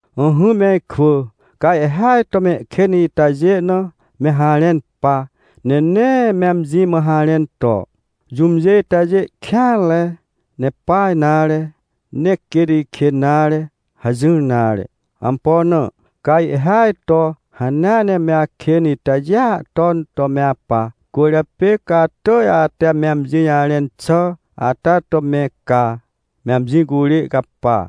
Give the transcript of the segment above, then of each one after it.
Ỹhỹ me ikwỳ, ca ihhêaj to mehkên itajê na me harẽn pa, ne nee me amji mã harẽn to: — Jũmjê itajê kêanre, ne pa nare, nee quêt ikên nare — hajỹr nare. Ampo na? Ca ihhêaj to hanea ne me akên itajêa ton to me apa. Cwỳrjapê ca atỳj ate me amji jarẽn xà ata to me caa, me amji curê capa.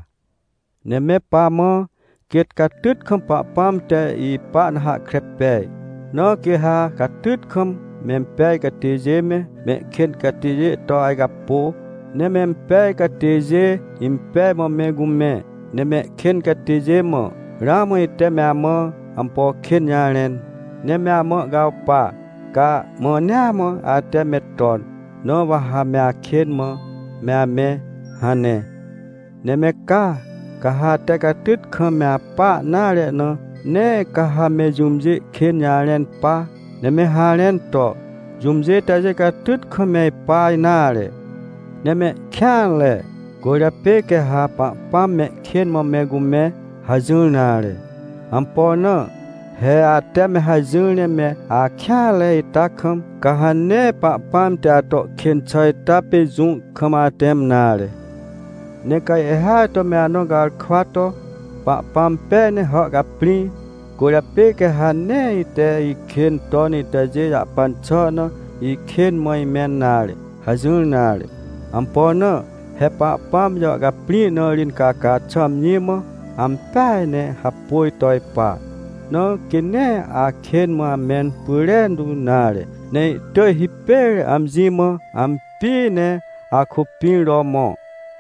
Ne me pamã, quêt catyt kam Pahpãm te ipa na hahkre pej. Na quê ha catyt kam mempej catêjê me, mehkên catêjê to ajcapô, ne mempej catêjê impej mã me cumẽ, ne mehkên catêjê mã: — Ramã ite me amã ampo kên jarẽn, ne me amã ihcawpa, ca mãnea mã ate me ton, na wa ha me akên mã me amẽ — hane. Ne me ca, ca ha ate catyt kam me apa nare na, nee ca ha me jũmjê kên jarẽn pa, ne me harẽn to: — Jũmjê itajê catyt kam me ipa nare, ne mehkêanre, cwỳrjapê quê ha Pahpãm mehkên mã me cumẽ — hajỹr nare! Ampo na? He ate me hajỹar ne me akêanre ita kam, ca ha nee Pahpãm te ato kên xà ita pê jũ kam atẽm nare. Ne ca ihhêaj to me anõ garkwa to: — Pahpãm pej ne hàhcaprĩ, cwỳrjapê quê ha nee ite ikên ton itajê jahpan xà na ikên mã imẽn nare — hajỹr nare! Ampo na? He Pahpãm jàhcaprĩ na ri incaca xà amji mã ampeaj ne hapôj to ipa. Na quê nee akên mã amẽn pyrentu nare, ne ihtỳj hipêr amji mã ampi ne akôpĩr to mõ,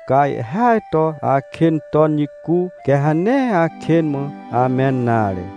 ca ihhêaj to akên ton jicu, quê ha nee akên mã amẽn nare.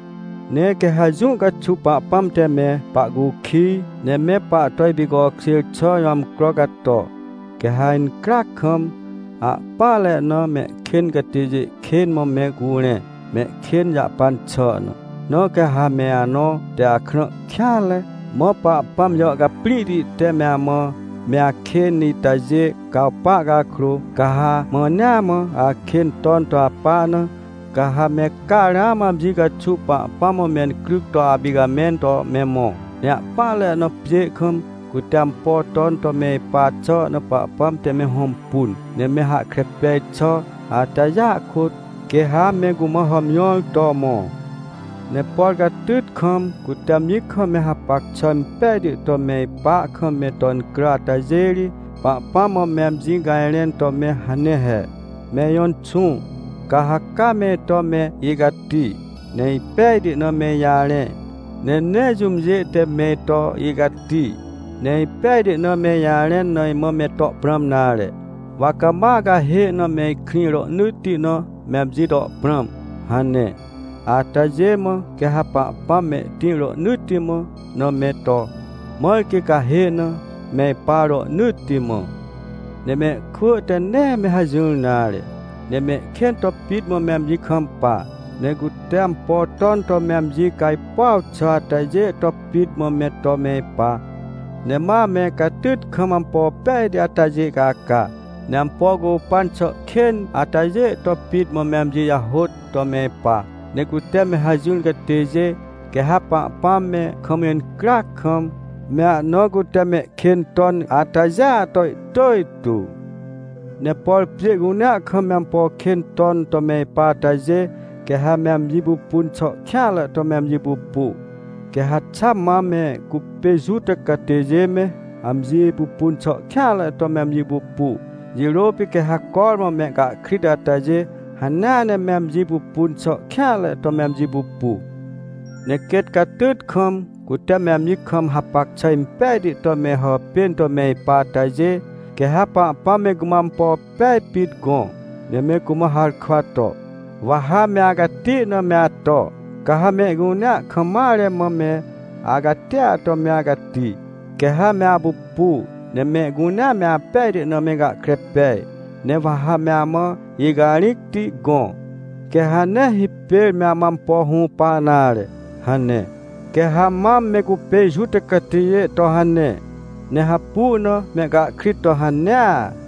Ne quê ha jũ caxuw Pahpãm te me pahcukij, ne me pahto ipicokjêr xà jõ amcro cato, quê ha incryac kam, ahpỹanre na mehkên catêjê kên mã me curẽ, mehkên jahpan xà na. Na ca ha me anõ te akrã kêanre, mã Pahpãm jàhcaprĩhti te me amã me akên itajê cawpa cakrô, ca ha mãnea mã akên ton to apa na, ca ha me ca ramã amji caxuw Pahpãm mã mencryc to apicamẽn to me mõ. Ne ahpỹanre na pjê kam, cute ampo ton to me ipa xà na Pahpãm te me hõmpun, ne me hahkre pej xà atajêa kôt, quê ha me cumã hàmjõr to mõ. Ne por catyt kam, cute amji kam me hapac xà impejti to me ipa kam me to incrà atajê ri, Pahpãm mã me amji cajrẽn to me hane he: — Me ijõ Inxũ, ca ha ca me ito me icati, ne ipejti na me ijarẽ. Ne nee jũmjê te me ito icati, ne ipejti na me ijarẽn na imã me to prãm nare. Wa cama acahê na me ikrĩ rohnỳtti na me amji to prãm — hane. Atajê mã quê ha Pahpãm mehtĩr rohnỳtti mã na me to, mãr quê cahê na me ipa rohnỳtti mã. Ne mehkwỳ te nee me hajỹr nare, ne mehkên to pit mã me amji kampa. Ne cute ampo ton to me amji cajpuaw xà atajê to pit mã me to me ipa. Ne ma ame catyt kam ampo pejti atajê caca, ne ampo cupan xà kên atajê to pit mã me amji jahôt to me ipa. Ne cute me hajỹr catêjê, quê ha Pahpãm me kam incryac kam, me ahna cute mehkên ton atajêa to ihtỳj tu. Ne por pjê cunea kam me ampo kên ton to me ipa atajê, quê ha me amji pupun xà kêanre to me amji pupu. Quê ha xa mam me cupê Juta catêjê me amji pupun xà kêanre to me amji pupu, jirô pê quê ha cormã mehcahkrit atajê hanea ne me amji pupun xà kêanre to me amji pupu. Ne quêt catyt kam, cute me amji kam hapac xà impejti to me hàpên to me ipa atajê, quê ha Pahpãm me cumã ampo pej pit gõ, ne me cumã harkwa to: — Wa ha me acati na me ato, ca ha mehcunea kam mare mã me acatia to me acati, quê ha me apupu, ne mehcunea me apejti na me gahkre pej. Ne wa ha me amã icarĩcti gõ, quê ha nee hipêr me amã ampo hũpa nare — hane. Quê ha mam me cupê Juta catêjê to hane, ne hapu na mehcahkrit to hanea.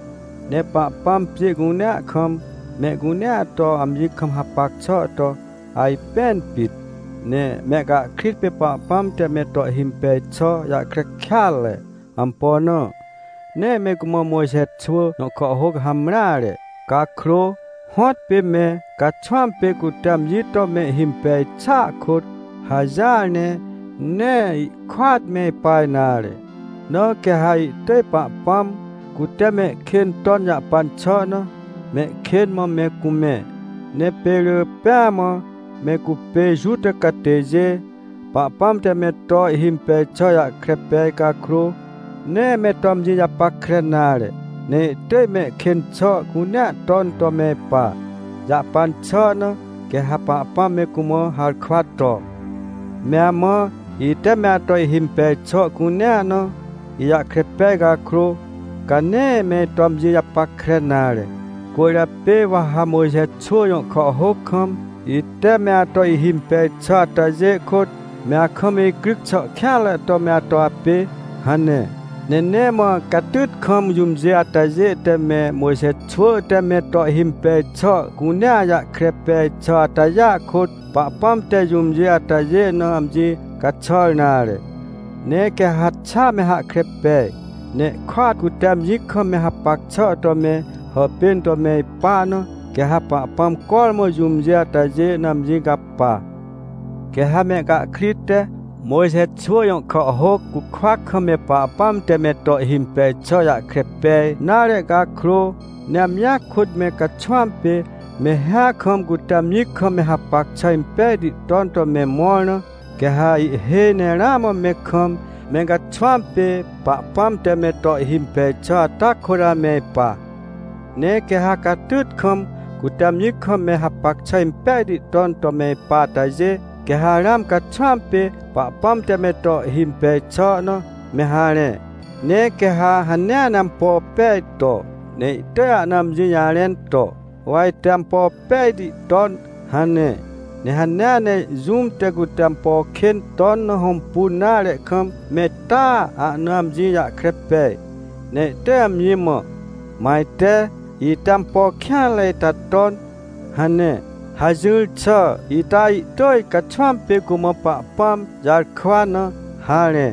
Ne Pahpãm pjê cunea kam, mehcunea to amji kam hapac xà to ajpẽn pit. Ne mehcahkrit pê Pahpãm te me to ihhimpej xà jahkre kêatre. Ampo na? Nee me cumã Mojxe xwỳ jõ kàhhôc hamreare. Cakrô, hõtpê me caxwãm pê cute amji to me ihhimpej xàa kôt, hajỹar ne, nee ihkôat me ipa nare. Na quê ha ihtỳj Pahpãm, cute mehkên ton jahpan xà na, mehkên mã me cumẽ. Ne pê rỳ pêa mã me cupê Juta catêjê, Pahpãm te me to ihhimpej xà jahkre pej cakrô, nee me to amji japackre nare, ne ihtỳj mehkên xà cunea ton to me ipa. Jahpan xà na quê ha Pahpãm me cumã harkwa to: — Me amã, ite me ato ihimpej xà cunea na, ijahkre pej cakrô, ca nee me ito amji japackre nare, cwỳrjapê wa ha Mojxe xwỳ jõ kàhhôc kam, ite me ato ihhimpej xà atajê kôt, me akam icryc xà kêanre to me ato apê — hane. Ne nee mã catyt kam jũmjê atajê te me Mojxe xwỳ te me to ihhimpej xà cunea jahkre pej xà atajê kôt, Pahpãm te jũmjê atajê na amji caxàr nare. Ne quê ha xa me hahkre pej, ne ihkôat cute amji kam me hapac xà to me hàpên to me ipa na, quê ha Pahpãm cormã jũmjê atajê na amji capa. Quê ha mehcahkrit te Mojxe xwỳ jõ kàhhôc cukwa kam me Pahpãm te me to ihhimpej xà jahkre pej nare cakrô, ne amjia kôt me caxwãm pê, me hĩa kam cute amji kam me hapac xà impejti ton to me mõr na, quê ha ihhêj ne ramã me kam, me caxwãm pê Pahpãm te me to ihhimpej xà ata kôt ame ipa. Ne quê ha catyt kam, cute amji kam me hapac xà impejti ton to me ipa atajê, quê ha ramã caxwãm pê Pahpãm te me to ihhimpej xà na me harẽ. Ne quê ha hanea ne ampo pej to, ne ihtỳj ahna amji jarẽn to: — Wa ite ampo pejti ton — hane. Ne hanea ne jũm te cute ampo kên ton na hõmpun nare kam, me taa ahna amji jahkre pej, ne ihtỳj amji mã: — Mã ajte, ite ampo kêanre ita ton — hane. Hajỹr xà ita ihtỳj caxwãm pê cumã Pahpãm jarkwa na harẽ.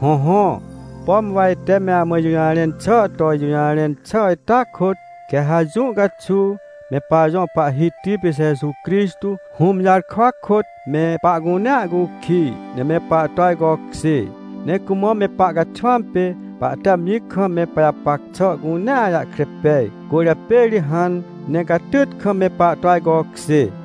Hõhõ, pom wa ite me amã ijũjarẽn xà to ijũjarẽn xà ita kôt, quê ha jũ caxuw me pajõ Pahhiti pê Jeju Crixtô, Hũm jarkwa kôt me pahcunea cukij, ne me pahto ajcokjê. Ne cumã me pahcaxwãm pê pahte amji kam me pajapac xà cunea jahkre pej, cwỳrjapê ri hãn ne catyt kam me pahto ajcokjê.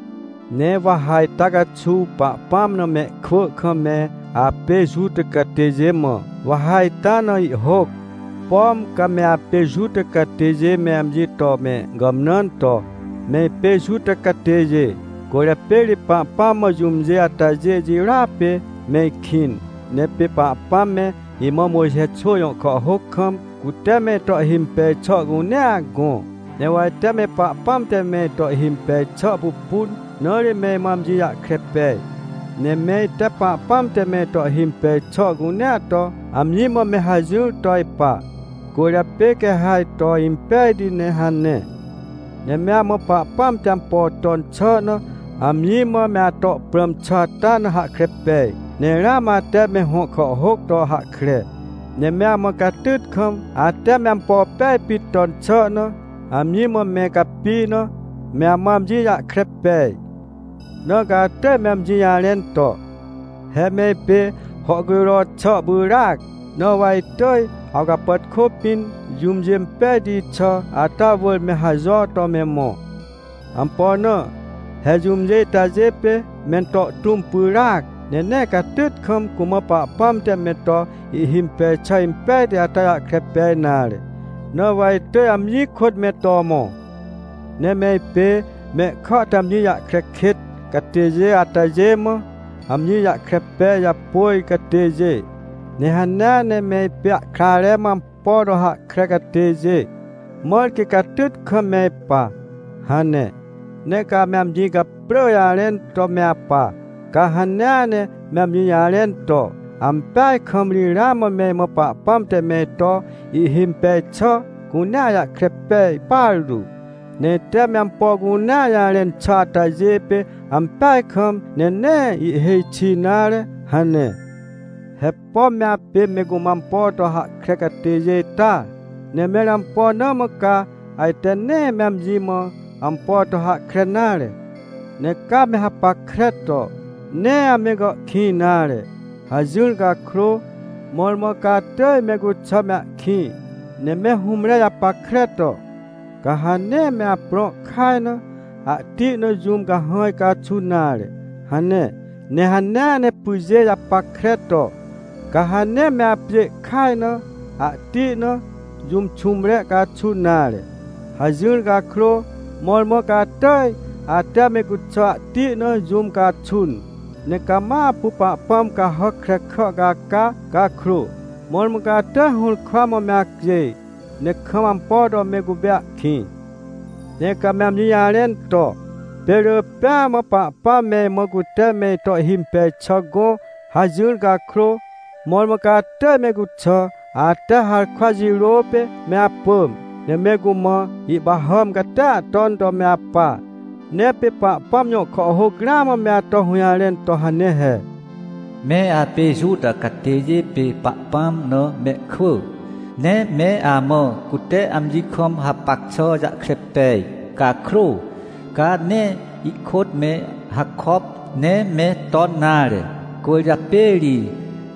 Ne wa ha ita caxuw Pahpãm na mehkwỳ kam me apê Juta catêjê mã, wa ha ita na ihhôc. Pom ca me apê Juta catêjê me amji to me gàmnãn to: — Me ipê Juta catêjê, cwỳrjapê ri Pahpãm mã jũmjê atajê jirôa pê me ikĩn. Ne pê Pahpãm me imã Mojxe xwỳ jõ kàhhôc kam, cute me ito ihhimpej xà cunea gõ, ne wa ite me Pahpãm te me ito ihhimpej xà pupun, na ri me imã amji jahkre pej. Ne me ite Pahpãm te me ito ihhimpej xà cunea to amji mã me hajỹr to ipa, cwỳrjapê quê ha ito impejti ne — hane. Ne me amã Pahpãm te ampo ton xà na amji mã me ato prãm xà ata na hahkre pej. Ne ramã ate me hõ kàhhôc to hahkre, ne me amã catyt kam, ate me ampo pej pit ton xà na, amji mã me capi na, me amã amji jahkre pej. Na ca atỳj me amji jarẽn to: — He me ipê hàhcujro xà pyràac, na wa itỳj awcapàtkô pĩn, jũmjê impejti xà ata wỳr me hajo to me mõ. Ampo na? He jũmjê itajê pê mento tũm pyràac, ne nee catyt kam cumã Pahpãm te me to ihhimpej xà impejti ata jahkre pej nare, na wa itỳj amji kôt me to mõ. Ne me ipê, mehkà te amji jahkre kêt catêjê atajê mã, amji jahkre pej japôj catêjê. Ne hanea ne me ipê ahkrare mã ampo to hahkre catêjê, mãr quê catyt kam me ipa — hane. Ne ca ame amji caprỳ jarẽn to me apa. Ca hanea ne me amji jarẽn to: — Ampeaj kam ri ramã me imã Pahpãm te me ito ihhimpej xà cunea jahkre pej partu, ne ite me ampo cunea jarẽn xà atajê pê ampeaj kam, ne nee ihhêj xi nare — hane. He pom me apê me cumã ampo to hahkre catêjê ita? Ne mẽr ampo na mã ca ajte nee me amji mã ampo to hahkre nare? Ne ca me hapackre to: — Nee ame gàhkĩj nare — hajỹr cakrô, mõrmõ ca atỳj me cuxà me ahkĩ. Ne me hũmre japackre to: — Ca ha nee me aprõ kaj na, ahti na, jũm cahãj caxun nare — hane. Ne hanea ne pyjê japackre to: — Ca ha nee me apjê kaj na, ahti na, jũm xũmre caxun nare — hajỹr cakrô, mõrmõ ca atỳj ate me cuxà ahti na jũm caxun. Ne cama apu pahpãm cahàc krekà caca cakrô, mõrmõ ca atỳj hũrkwa mã me acjêj, ne kam ampo to me cupê ahkĩ. Ne ca me amji jarẽn to: — Pê rỳ pêa mã Pahpãm me imã cute me ito ihhimpej xà gõ — hajỹr cakrô, mõrmõ ca atỳj me cuxà, ate harkwa jirô pê me apỳm, ne me cumã ihpahàm catia ton to me apa. Ne pê Pahpãm jõ kàhhôc ramã me ato hũjarẽn to hane he: “Me apê Juta catêjê pê Pahpãm na mehkwỳ. Ne me amã cute amji kam hapac xà jahkre pej cakrô, ca nee ihkôt me hakop, ne me ton nare. Cwỳrjapê ri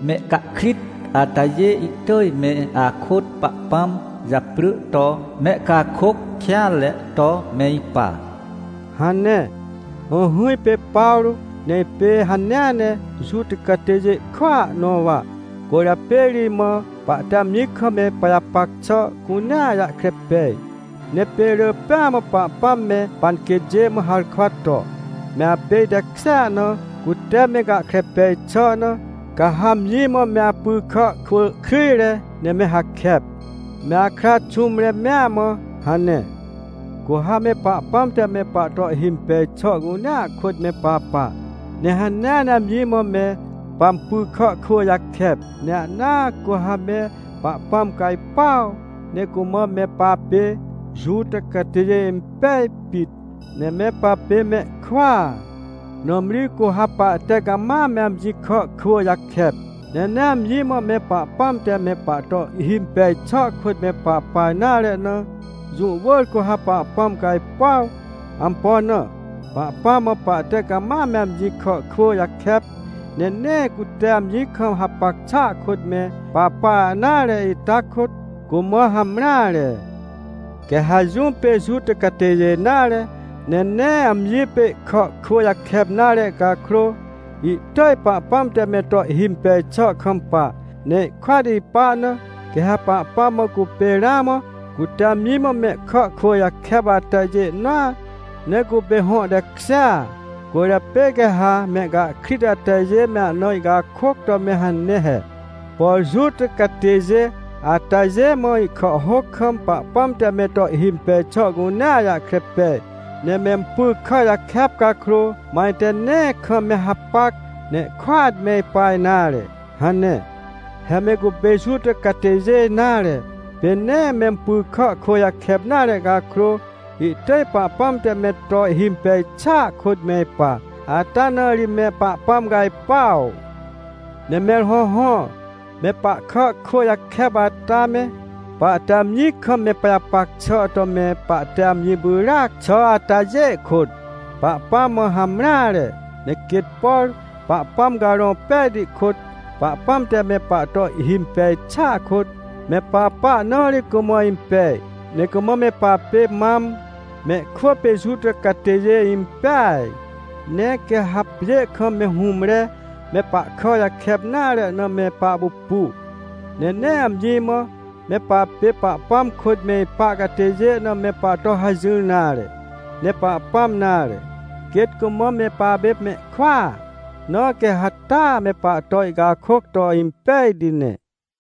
mehcahkrit atajê ihtỳj me akôt Pahpãm japrỳ to mehcakôc kêanre to me ipa” hane. Ỹhỹ, ipê Pawrô, ne ipê hanea ne Juta catêjê kwỳa nõ wa. Cwỳrjapê ri imã pahte amji kam me pajapac xà cunea jahkre pej. Ne pê rỳ pêa mã Pahpãm me panquêtjê mã harkwa to: “Me apê itekjêa na, cute me gahkre pej xà na, ca ha amji mã me apy kà kwỳ kryjre ne me hakep, me akra xũmre mea mã” hane. Cu ha me Pahpãm te me pahto ihhimpej xà cunea kôt me papa, ne hanea ne amji mã me pampy kà kwỳ jakep, ne ahnaa cu ha me Pahpãm cajpuaw, ne cumã me papê Juta catêjê impej pit, ne me papê mehkwỳa. Nãmri cu ha pahte cama me amji kà kwỳ jakep, ne nee amji mã me Pahpãm te me pahto ihhimpej xà kôt me papa nare na, jũ wỳr cu ha Pahpãm cajpuaw. Ampo na? Pahpãm mã pahte cama me amji kà kwỳ jakep, ne nee cute amji kam hapac xà kôt me papa nare ita kôt, cumã hamreare. Quê ha jũm pê Juta catêjê nare, ne nee amji pê ihkà kwỳ jakep nare cakrô, ihtỳj Pahpãm te me to ihhimpej xà kampa, ne ihkôt ipa na, quê ha Pahpãm mã cupê ramã cute amji mã mehkà kwỳ jakep atajê nõa, ne cupê hõ tekjêa. Cwỳrjapê quê ha mehcahkrit atajê me ana ihcakôc to me hane he: — Por Juta catêjê atajê mã ihkàhhôc kam Pahpãm te me to ihhimpej xà cunea jahkre pej, ne mempy kà jakep cakrô, mã ajte nee kam me hapac, ne ihkôat me ipa nare — hane. He me cupê Juta catêjê nare, pê nee mempy kà kwỳ jakep nare cakrô, ihtỳj Pahpãm te me to ihhimpej xàa kôt me ipa, ata na ri me Pahpãm cajpuaw. Ne mẽr hõhõ, me pahkà kwỳ jakep ata me, pahte amji kam me pajapac xà to me pahte amji pyràc xà atajê kôt, Pahpãm mã hamreare. Ne quêt, por Pahpãm Carõ Pejti kôt, Pahpãm te me pahto ihhimpej xàa kôt me papa na ri cumã impej, ne cumã me papê mam, mehkwỳ pê Juta catêjê impeaj. Ne quê ha pjê kam me hũmre me pahkà jakep nare na me pahpupu, ne nee amji mã, me papê Pahpãm kôt me ipa catêjê na me pahto hajỹr nare. Ne Pahpãm nare, quêt cumã me papê mehkwỳa, na quê ha taa me pahto ihcakôc to impejti ne.